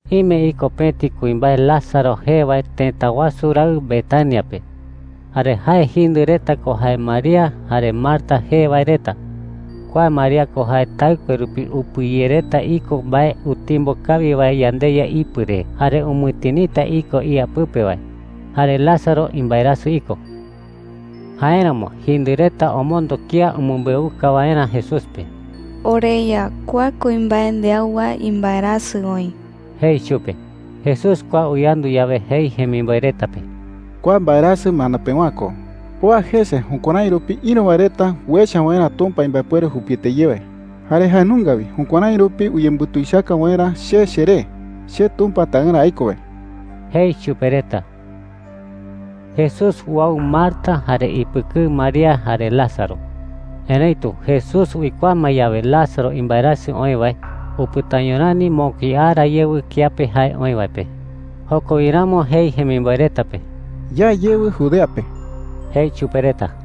Ime iko pëti kuimbae Lázaro jee wae tëta wasu raɨ Betania pe. Jare jae jindɨ reta ko jae María jare Marta jee wae reta. Kua María ko jae taɨkue rupi upɨyereta iko mbae utimbo kawi wae yandeYa ipɨ re jare umɨtinita iko ía pɨpe wae. Jare Lázaro imbaerasɨ iko. Jáeramo jindɨ reta omondo kía umɨmbeuka waerä Jesús pe: “OreYa, kua kuimbae ndeau wae imbaerasɨ oï,” jei chupe. Jesús kua uyandu yawe, jei jemimboe reta pe: “Kua mbaerasɨ mano pewa’ä ko. Oa jese jukuärái rupi ïru wae reta uecha waerä Tumpa imbaepuere jupiete ye wae, jare jae nunga wi jukuärái rupi uyembutuichaka waerä che cheree, che Tumpa Taɨrä aiko wae,” jei chupe reta. Jesús uau Marta jare ipɨkɨɨ María jare Lázaro. Erëitu Jesús uikuaa ma yawe Lázaro imbaerasɨ oï wae, upɨtaño rani mokui ara yewɨ kiape jae oï wae pe. Joko wi ramo jei jemimboe reta pe: “Ya yewɨ Judea pe,” jei chupe reta.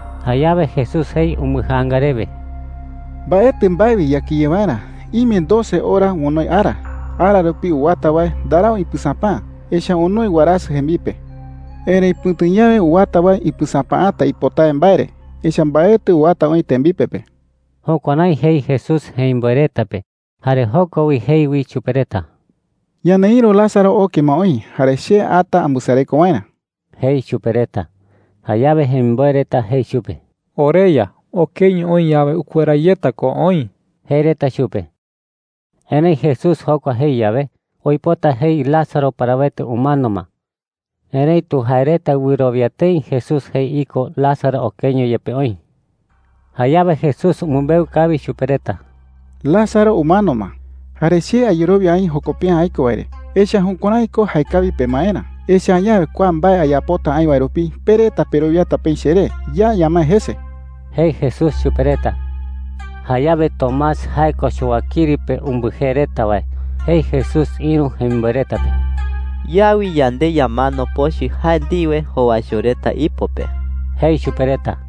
Jayawe Jesús jei umbɨjaanga rewe: “Mbaetɨ mbae wi yakɨye waerä. Ime doce ora onoi ara. Ara rupi uwata wae ndarau ipɨsapäa, echa’ä onoi warasɨ jembipe,” jei. “Erëi pɨ̈tu yawe uwata wae ipɨsapäata ipotawe mbae re, echa’ä mbaetɨ uwata oï tembipe pe.” Jukuärái jei Jesús jemimboe reta pe. Jare joko wi jei wi chupe reta: “Ñaneïru Lázaro oke ma oï, jare che ata ambɨsareko waerä,” jei chupe reta. Jayawe jemimboe reta jei chupe: “OreYa, okeño oï yawe, ukuera yeta ko oï,” jei reta chupe. Erëi Jesús jokua jei yawe, uipota jei Lázaro parawete umano ma. Erëitu jae reta wɨrowia tëi Jesús jei iko Lázaro okeño yepe oï. Jayawe Jesús umɨmbeu kawi chupe reta: “Lázaro umano ma. Jare che ayerowia aï joko pe’ä aiko wae re. Echa’ä jukuärái ko jaekawi pemaerä. Echa’ä añawe kua mbae ayapota aï wae rupi pe reta perowiata peï cheré. Ya ñamae jese,” jei Jesús chupe reta. Jayawe Tomás – jae ko Chowakiri pe umbɨjee reta wae – jei Jesús ïru jemimboe reta pe: “Ya wi yande ñamano pochɨ jae ndiwe jowaicho reta ipo pe,” jei chupe reta.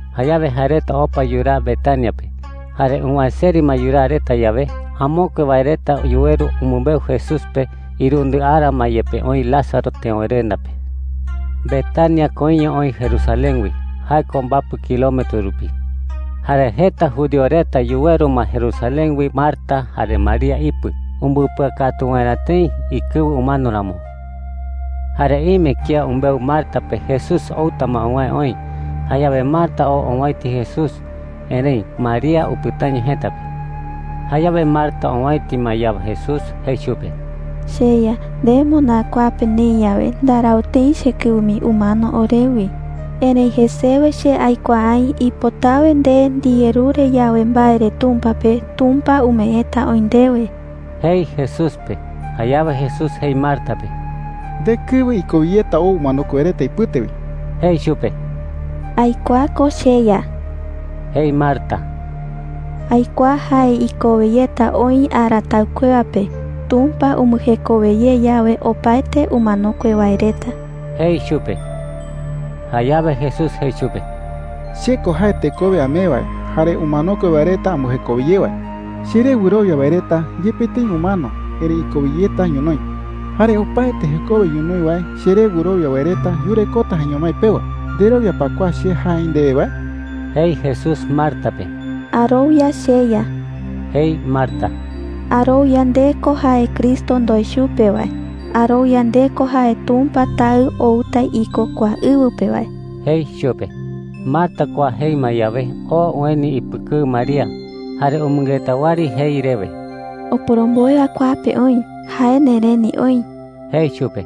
Jayawe jae reta opa yuraa Betania pe. Jare uwäe seri ma yuraa reta yawe, amokue wae reta yuweru umɨmbeu Jesús pe irundɨ ara ma yepe oï Lázaro teöwerenda pe. Betania koiño oï Jerusalén wi. Jae ko mbapɨ kilometro rupi. Jare jeta judío reta yuweru ma Jerusalén wi Marta jare María ipɨ umbɨpɨakatu waerä tëi ikɨwɨ umano ramo. Jare ime kía umbeu Marta pe Jesús outa ma uwäe oï. Jayawe Marta oo owäiti Jesús. Erëi María upɨtaño jëta pe. Jayawe Marta owäiti ma yawe Jesús, jei chupe: “CheYa, nde moná kua pe neï yawe, ndarau tëi chekɨwɨ mii umano orewi. Erëi jesewe che aikuaa aï ipotawe nde ndiyerure yawe mbae re Tumpa pe, Tumpa umeeta oï ndewe,” jei Jesús pe. Jayawe Jesús jei Marta pe: “Ndekɨwɨ ikowe yeta ou umanokue wae reta ipɨte wi,” jei chupe. “Aikuaa ko, cheYa,” jei Marta. “Aikuaa jae ikowe yeta oï ara taɨkuewa pe, Tumpa umbɨjekowe ye yawe opaete umanokue wae reta,” jei chupe. Jayawe Jesús jei chupe: “Che ko jae tekowe amee wae jare umanokue wae reta ambɨjekowe ye wae,” jei chupe. “Cheré wɨrowia wae reta, yepe tëi umano, erëi ikowe yeta ñonoï. Jare opaete jekowe ñonoï wae cheré wɨrowia wae reta yurekota jaeño mái pewa. ¿Nderowia pa kua che jae aï ndewe wae?” jei Jesús Marta pe. “Arowia, cheYa,” jei Marta. “Arowia nde ko jae Cristo ndoe chupe wae. Arowia nde ko jae Tumpa Taɨ outa iko kua ɨwɨ pe wae,” jei chupe. Marta kua jei ma yawe, oo ueni ipɨkɨɨ María. Jare umɨngeta wɨari jei rewe: “Oporomboe wae kua pe oï. Jae nereni oï,” jei chupe.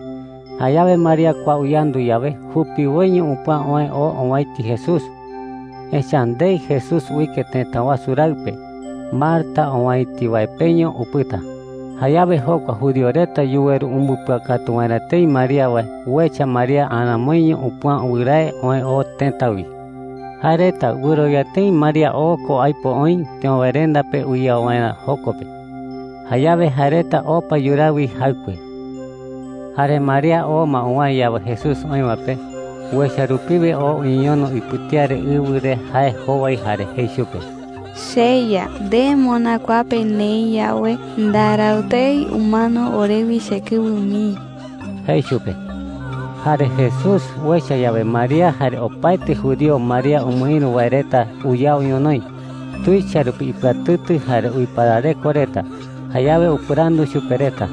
Jayawe María kua uyandu yawe, jupiwoiño upüa oë oo owäiti Jesús, echa’ä ndei Jesús uike tëta wasu raɨ pe. Marta owäiti wae peño upɨta. Jayawe jokua judío reta yuweru umbɨpɨakatu waerä tëi María wae uecha María aramoiño upüa wɨrae oë oo tëta wi. Jae reta wɨrowia tëi María oo ko aipo oï teöwerenda pe uyao waerä joko pe. Jayawe jae reta opa yuraa wi jaɨkue. Jare María oo ma uwäe yawe Jesús oï wae pe, uecha rupiwe oo uñeñono ipɨtía re ɨwɨ re jae jowai jare jei chupe: “CheYa, nde moná kua pe neï yawe, ndarau tëi umano orewi chekɨwɨ mii,” jei chupe. Jare Jesús uecha yawe María jare opaete judío María umɨïru wae reta uyao ñonoï, tuicha rupi ipɨatɨtɨ jare uiparareko reta. Jayawe upɨrandu chupe reta: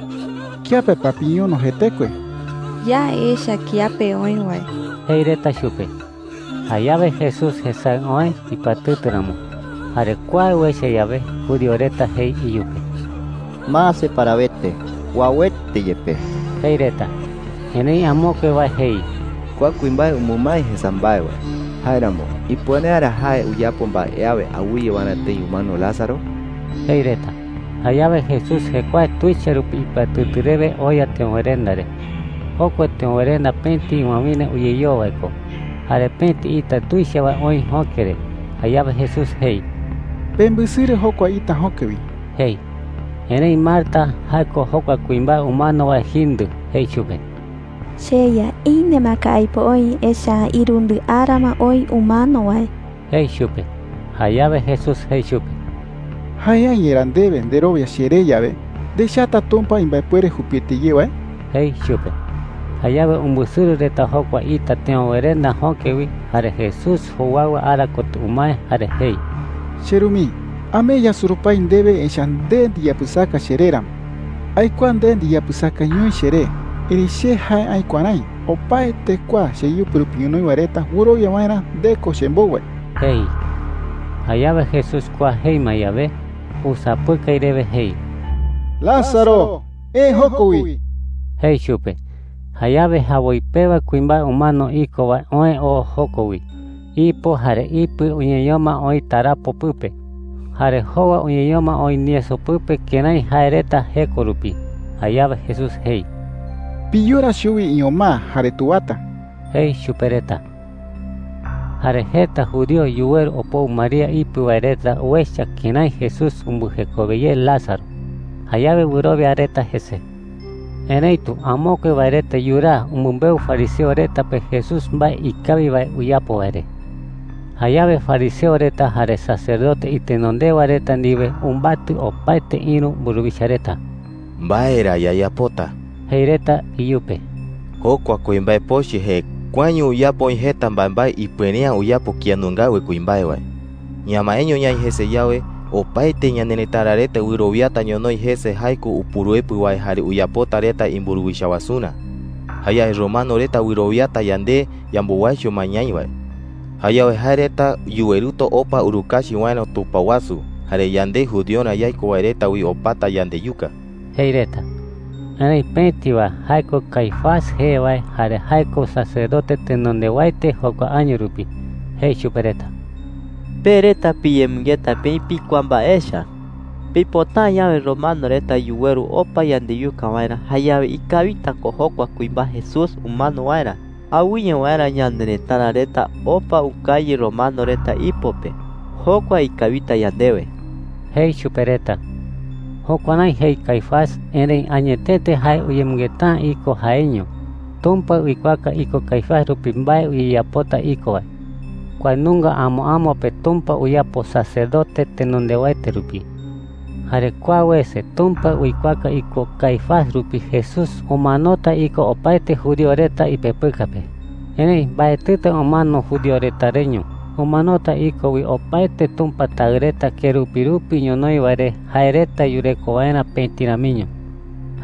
“¿Kiape pa piñono jetekue?” jei. “Ya echa kiape oï wae,” jei reta chupe. Jayawe Jesús jesaɨ oë ipɨatɨtɨ ramo. Jare kua uecha yawe, judío reta jei iyupe: “Mase parawete, uauete yepe,” jei reta. Erëi amokue wae jei: “Kua kuimbae umɨmae jesa mbae wae. Jáeramo, ¿ipuere’ä ra jae uyapo mbae awe awɨye waerä tëi umano Lázaro?” jei reta. Jayawe Jesús jekuae tuicha rupi ipɨatɨtɨ rewe oya teöwerenda re. Jokua teöwerenda pëti ɨwawïra uyeyoo wae ko, jare pëti ita tuicha wae oï jöke re. Jayawe Jesús jei: “Pembɨsɨrɨ jokua ita jöke wi,” jei. Erëi Marta – jae ko jokua kuimbae umano wae jindɨ – jei chupe: “CheYa, ine ma ko aipo oï. Echa’ä irundɨ ara ma oï umano wae,” jei chupe. Jayawe Jesús jei chupe: “¿Jae’ä yerá ndewe nderowia cheré yawe, ndechata Tumpa imbaepuere jupiete ye wae?” jei chupe. Jayawe umbɨsɨrɨ reta jokua ita teöwerenda jöke wi. Jare Jesús jowaɨwa ara kotɨ umae jare jei: “CheRu mii, amee yasurupái ndewe, echa’ä nde ndiyapɨsaka cheré ramo. Aikuaa nde ndiyapɨsakañoi cheré. Erëi che jae aï kuärái opaete kua cheyɨpɨ rupi ñonoï wae reta wɨrowia waerä nde ko chembou wae,” jei. Jayawe Jesús kua jei ma yawe, usapɨkai rewe jei: “Lázaro, eë joko wi,” jei chupe. Jayawe jawoi pewa kuimbae umano iko wae oë oo joko wi. Ipo jare ipɨ uñeñoma oï tarapo pɨpe, jare jowa uñeñoma oï nieso pɨpe kërái jae reta jeko rupi. Jayawe Jesús jei: “Piyora chuwi iñomaa jare tuwata,” jei chupe reta. Jare jeta judío yuweru opou María ipɨ wae reta uecha kërái Jesús umbɨjekowe ye Lázaro. Jayawe wɨrowia reta jese. Erëitu amokue wae reta yuraa umɨmbeu fariseo reta pe Jesús mbae ikawi wae uyapo wae re. Jayawe fariseo reta jare sacerdote itenondewa reta ndiwe umbatɨ opaete ïru mburuwicha reta. “¿Mbae ra yayapota?” jei reta iyupe. “Jokua kuimbae pochɨ jekuaeño uyapo oï jeta mbaembae ipuere’ä uyapo kía nungawe kuimbae wae. Ñamaeño ñaï jese yawe, opaete ñanerëtara reta wɨrowiata ñonoï jese jae ko Upuruepɨ wae jare uyapota reta imburuwicha wasurä. Jayawe romano reta wɨrowiata yande yambowaicho ma ñaï wae. Jayawe jae reta yuweruta opa urukachi waerä tupao wasu, jare yande judiorä yaiko wae reta wi opata yandeyuka,” jei reta. Erëi pëti wae – jae ko Caifás jee wae jare jae ko sacerdote tenondewaete jokua año rupi – jei chupe reta: “Pe reta piyemɨngeta peï pikuaa mbae echa,” jei chupe reta. “Pipota’ä yawe romano reta yuweru opa yandeyuka waerä, jayawe ikawita ko jokua kuimbae Jesús umano waerä, awɨye waerä ñanerëtara reta opa ukañɨ romano reta ipo pe. Jokua ikawita yandewe,” jei chupe reta. Jukuärái jei Caifás, erëi añetete jae uyemɨngeta’ä iko jaeiño. Tumpa uikuaaka iko Caifás rupi mbae uyeyapota iko wae. Kua nunga amo amo pe Tumpa uyapo sacerdote tenondewaete rupi. Jare kua wese Tumpa uikuaaka iko Caifás rupi Jesús umanota iko opaete judío reta ipepɨka pe. Erëi mbaetɨta umano judío reta reño. Umanota iko wi opaete Tumpa taɨ reta kerupi rupi ñonoï wae re jae reta yureko waerä pëti ramiño.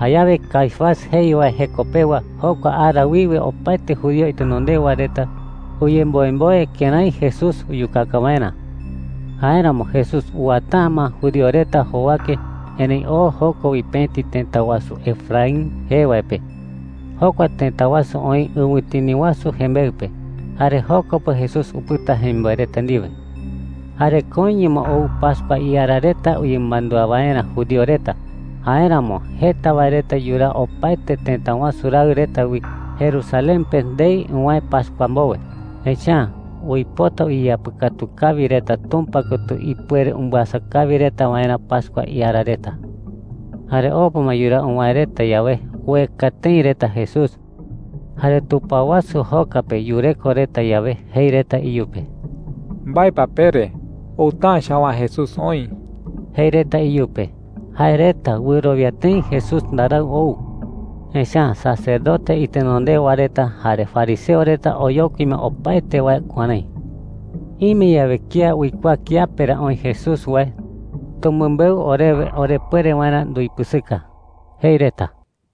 Jayawe Caifás jei wae jeko pewa, jokua ara wiwe opaete judío itenondewa reta uyemboemboe kërái Jesús uyukaka waerä. Jáeramo Jesús uwata’ä ma judío reta jowake, erëi oo joko wi pëti tëta wasu Efraín jee wae pe. Jokua tëta wasu oï ɨwɨtini wasu jembeɨ pe. Jare joko pe Jesús upɨta jemimboe reta ndiwe. Jare koiño ma ou pascua iara reta uyemɨmandúa waerä judío reta. Jáeramo jeta wae reta yuraa opaete tëta wasu raɨ reta wi Jerusalén pe ndei uwäe pascua mbowe. Echa’ä uipota uyeyapɨkatu kawi reta Tumpa kotɨ ipuere umbɨasa kawi reta waerä pascua iara reta. Jare opa ma yuraa uwäe reta yawe, ueka tëi reta Jesús. Jare tupao wasu joka pe yureko reta yawe, jei reta iyupe: “¿Mbae pa pere? Outa’ä chawaa Jesús oï,” jei reta iyupe. Jae reta wɨrowia tëi Jesús ndarau ou, echa’ä sacerdote itenondewa reta jare fariseo reta oyokui ma opaete wae kuärái: “Ime yawe kía uikuaa kiape ra oï Jesús wae, tumɨmbeu orewe orepuere waerä nduipɨsɨka,” jei reta.